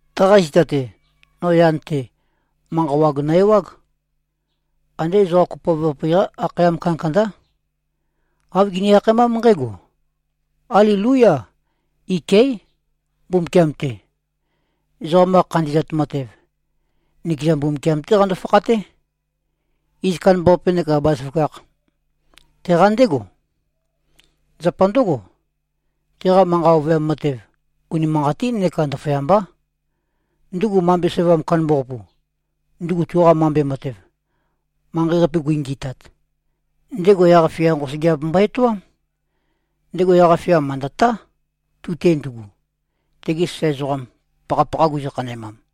Taqa zita-te, no yan-te, manqa wag nø-ewág. Andé ezoqa kopoav-qapi-qá akhayam kandakandá. Āv gini-akhaemám nqǽgo, “Alelúya. Iké꞉ Mbumbukiam-te. Ezoqam-qa khandi꞉zat matev, nikeza Mbumbukiam-té qando-fakhaté. Iz kandambaqape neka bazaføgakh, teqa ndégo. Zapa ndǿgo, teqa manqa ovøyam matev unimanqatín neka ndaføyambá. Ndugu mambe sævam kandambaqapu, ndugu tuqa mambe matev, manqei-qape gui-ngi꞉tat, ndego yaq-fia nqosøgeap mbo-etoám. Ndego yaq-fia mø̀ndøtá, tu-te ndugu, tegi sasae ezoqam, pakhapakha guzø-khanæmam.”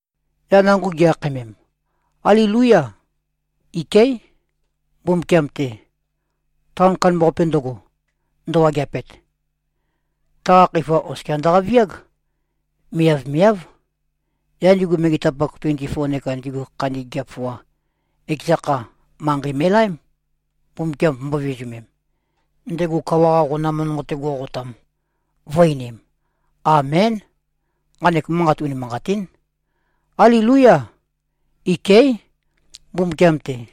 Yaq nango gi-akhaemem, “Alelúya. Iké꞉ Mbumbukiam-te. Taon kandambaqape ndøgo, ndøwageapet, taqa khøifa oskia ndøqaviág. Miavmiáv.” Yaq ndigu megetapak tuenti-foa neka ndigu khandi gigiap foa, ekeza kha, manqei me꞉laém, Mbumbukiam vømbō-vizumem, ndego kawa-qa qonam nonqo-te go꞉qotam, vø̄-einim, “Amén. Nqanek manqat unimanqatín. Alelúya. Iké꞉ Mbumbukiam-te.”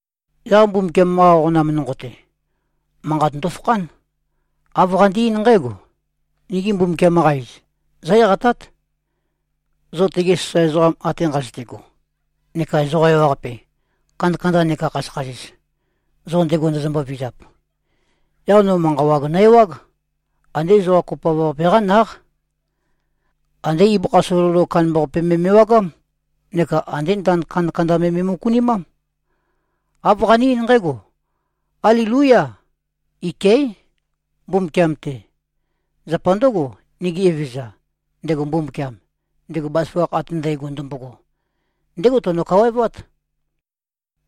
Yaq Mbumbukiam-qa qonam nonqo-te, manqat ndofakhán. Āv qande-eín nqǽgo, “Nigi Mbumbukiam-qa iz, zó-eqatát, zo tegi sasae ezoqam ate nqazøte꞉go neka ezoqa ewaqape, kandakanda neka khasøkhasis, zo ndego ndozombo-vizap.” Yaq no manqa wag nø-ewág. Andé ezoqa kopoav-qape-qá náq. Andé ibøkha sololo kandambaqape me me꞉wagám neka andé ndand kandakanda me me꞉møkunimám. Āv qane-eín nqǽgo, “Alelúya. Iké꞉ Mbumbukiam-te. Zapa ndǿgo, nigi Evezøza, ndego Mbumbukiam, ndego bazaføgakh ate ndægo ndømbogo, ndégo teno-kawaevát.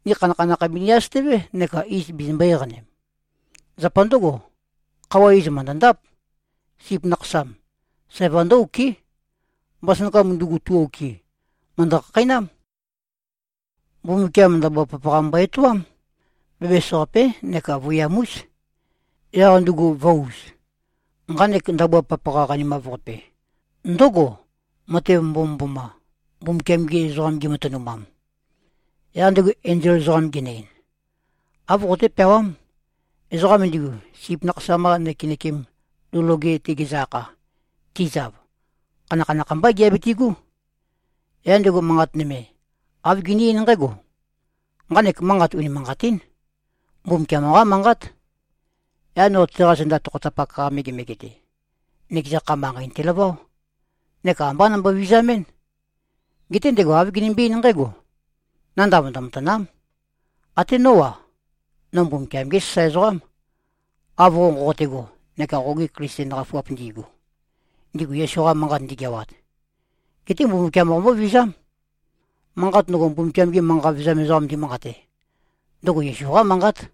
Ni khanakhanakh bini-asøtøvé neka iz bizimbō-eqanem. Zapa ndǿgo, khøuwa iz mø̀ndøndáp. Sip Nakhasam, sævam ndǿ-okɨ́. Mbasønakam ndugu, tu-okɨ, mø̀ndø-khakheinám. Mbumbukiam ndabua papaqa mbo-etoám. Bæbæs-qapé neka vøiyam-ús, yaq ndugu vø̄-uz.” (Nqanek ndabua papaqa qanimav-qape ndǿgo, matev mbomømboma, Mbumbukiam-gi ezoqam gimatønumam.) Yaq ndego enzol ezoqam genø-ein, “Āv qoqoté-peawám: Ezoqam ndigu, Sip Nakhasam-qa nøkenøkem lou loge-te gizø-akha, tizav, khanakhanakh mbá giabitigú.” Yaq ndego manqat nøme, āv gene-eín nqǽgo, “Nqanek manqat unimanqatín. Mbumbukiam-qá manqát.” Yaq no teqa zenda tokhotapak-qa megemege-te, nøkeza kha, manqei nøtelaváo. Neka ambá nombo-vizamɨ́n. Geté ndego āv genømbe-eín nqǽgo, “Nandav ndømatàna᷄m. Até nó-a, no Mbumbukiam-gé sasae ezoqám, av qo nqoqote꞉go neka qogi Klisten qafuap ndi꞉gu, ndigu Yesu-qa manqat ndigeawat. Geté Mbumbukiam qombóvizám. Manqat ndøgo, Mbumbukiam-gi manqa vevezam ezoqam ndimanqate, ndøgo Yesu-qá manqát.”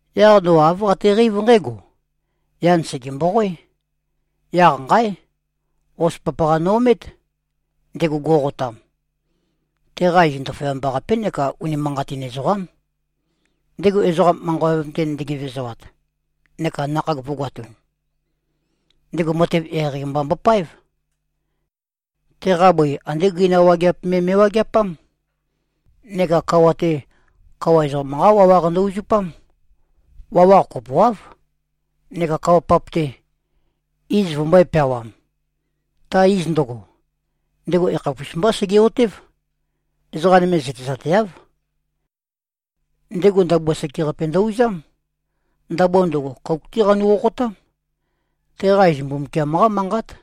Yaq no āv qateqeív nqǽgo: Yan sège-mboqoé. Yaq nqáe! Hos papaqa no-omét. Ndego go꞉qotam, teqa iz Ndaføyamba-qapé neka Unimanqatin Ezoqám. Ndego ezoqa manqa ovøyam-te ndegevezoat, neka nakhag vø̄goatun, ndego matev eqeieqei mba mbopáev. Teqa bøi andé gøina wageap me me꞉wageapám. Neka kawa-te, kawa ezoqam-qá wawaq ndø-uzupám. Wawaq kopoáv. Neka kawa-pap-te, iz vømbø̄e-peawam. Ta iz ndøgo, ndego yakhapus mbá sege꞉-otév. Ezoqa nøme zøtezateáv. Ndego ndabua sekeqape ndø-uzám. Ndabua ndøgo, kouk-té qanu-qoqotám. Teqa iz Mbumbukiam-qá Manqát.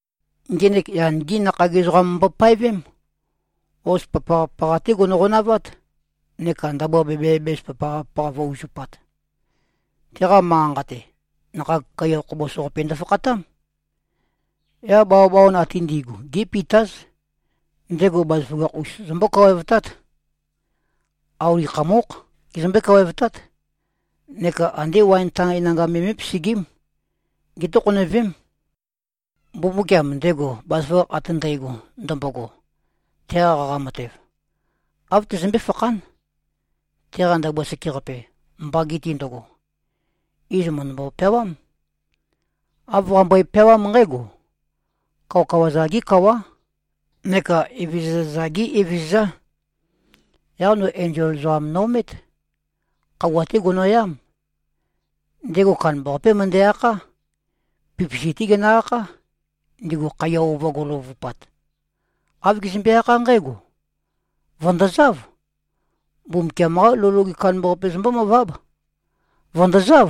Ngenek, yan-gí nakhag ezoqam mbopaevém. Hos papaqa-papaqa-té gono-qonavát, neka ndabua bæbæ-bæbæs papaqa-papaqa vø̄-uzupat. Teqa manqa-nqa-te, nakhag kaiya khobos-qapi ndofakhatám. Yaq bawabawan ate ndi꞉gu gé꞉pitáz. Ndego bazaføgakh-us zømbó-kawaevtát. Auli khamókh gezømbé-kawaevtát. Neka andé waen tae nanga me mé꞉pesegím. Gétokhonøvém. Mbumbukiam, ndego bazaføgakh ate ndægo ndømbogo, teqa qaqa matev, āv tøzømbé-fakhán. Teqa ndabua sekeqape, mbagi-te ndøgo, iz mø̀ndømbo-peawám. Āv qambøe-peawám nqǽgo: Kawakawa-za-gé Kawá neka evezøza-za-gé Evezøzá. Yaq no enzol ezoqam no-omét. Khøuwa-té gono꞉yám. Ndego kandambaqapé møndæ-akhá. Pipisi-té genø-akhá, ndigu khaiya ova go꞉løvøvupat. Āv gezømbe-akhá nqǽgo, “Vø̀ndozáv. Mbumbukiam-qá lou loge kandambaqape zombómøváb. Vø̀ndozáv.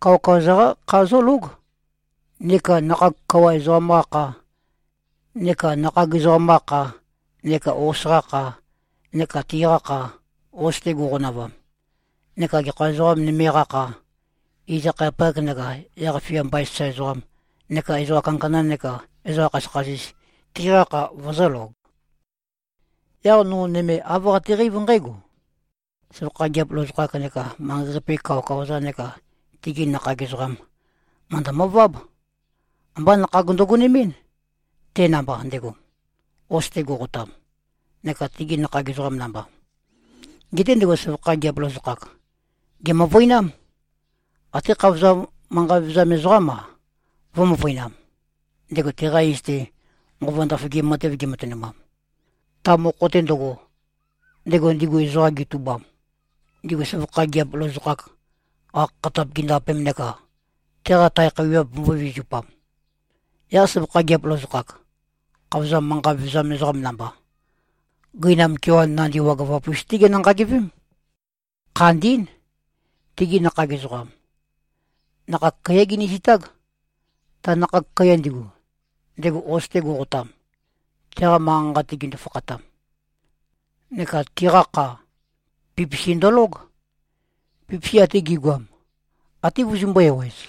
Kawakawa-za-qá kha zólóg neka nakhag kawa ezoqam-qa kha, neka nakhag ezoqam-qa kha, neka hos-qa kha, neka tiqa kha, hos-te go꞉qonavam, neka gekha ezoqa nøme-qa kha, iz-akhayapak neka yaq-fia mbain sasae ezoqam, neka ezoqa kandakanda neka ezoqa khasøkhasis, tiqa kha vøzø̄log.” Yaq no nøme, āv qateqeív nqǽgo: Søvakha gigiap lozokhak neka manqei-qape-gi kawakawa-za neka tigi nakhag ezoqam, mø̀ndømøváb. Ambá nakhag ndøgonemɨ́n, te namba ndego, hos-te go꞉qotam, neka tegi nakhag ezoqam namba. Geté ndego søvakha gigiap lozokhak, gèmøvøinám. Até khavozam manqa vevezam ezoqám-a, vø̄-møvøinam, ndego teqa iz-te nqova ndaføgim matev gematønumam, ta mokho-te ndøgo, ndego ndigu ezoqam getubam, ndigu søvakha gigiap lozokhak-qa khakhatap gindapem neka teqa tae khøuwiap vømbō-vizupam. Yaq søvakha gigiap lozokhak, khavozam manqa vevezam ezoqam namba, gøinam kewan nandi wagøvap-us-té ginø-nqagivém. Khandín. Tigi nakhag ezoqam, nakhag kaiyá ginizitág, ta nakhag kaiya ndigu, ndego hos-te go꞉qotam, teqa manqa-nqa-te gindu-fakhatam. Neka tiqa kha, pipisi ndølóg. Pipisi ate gi꞉goam, até vøzømbū-ewez.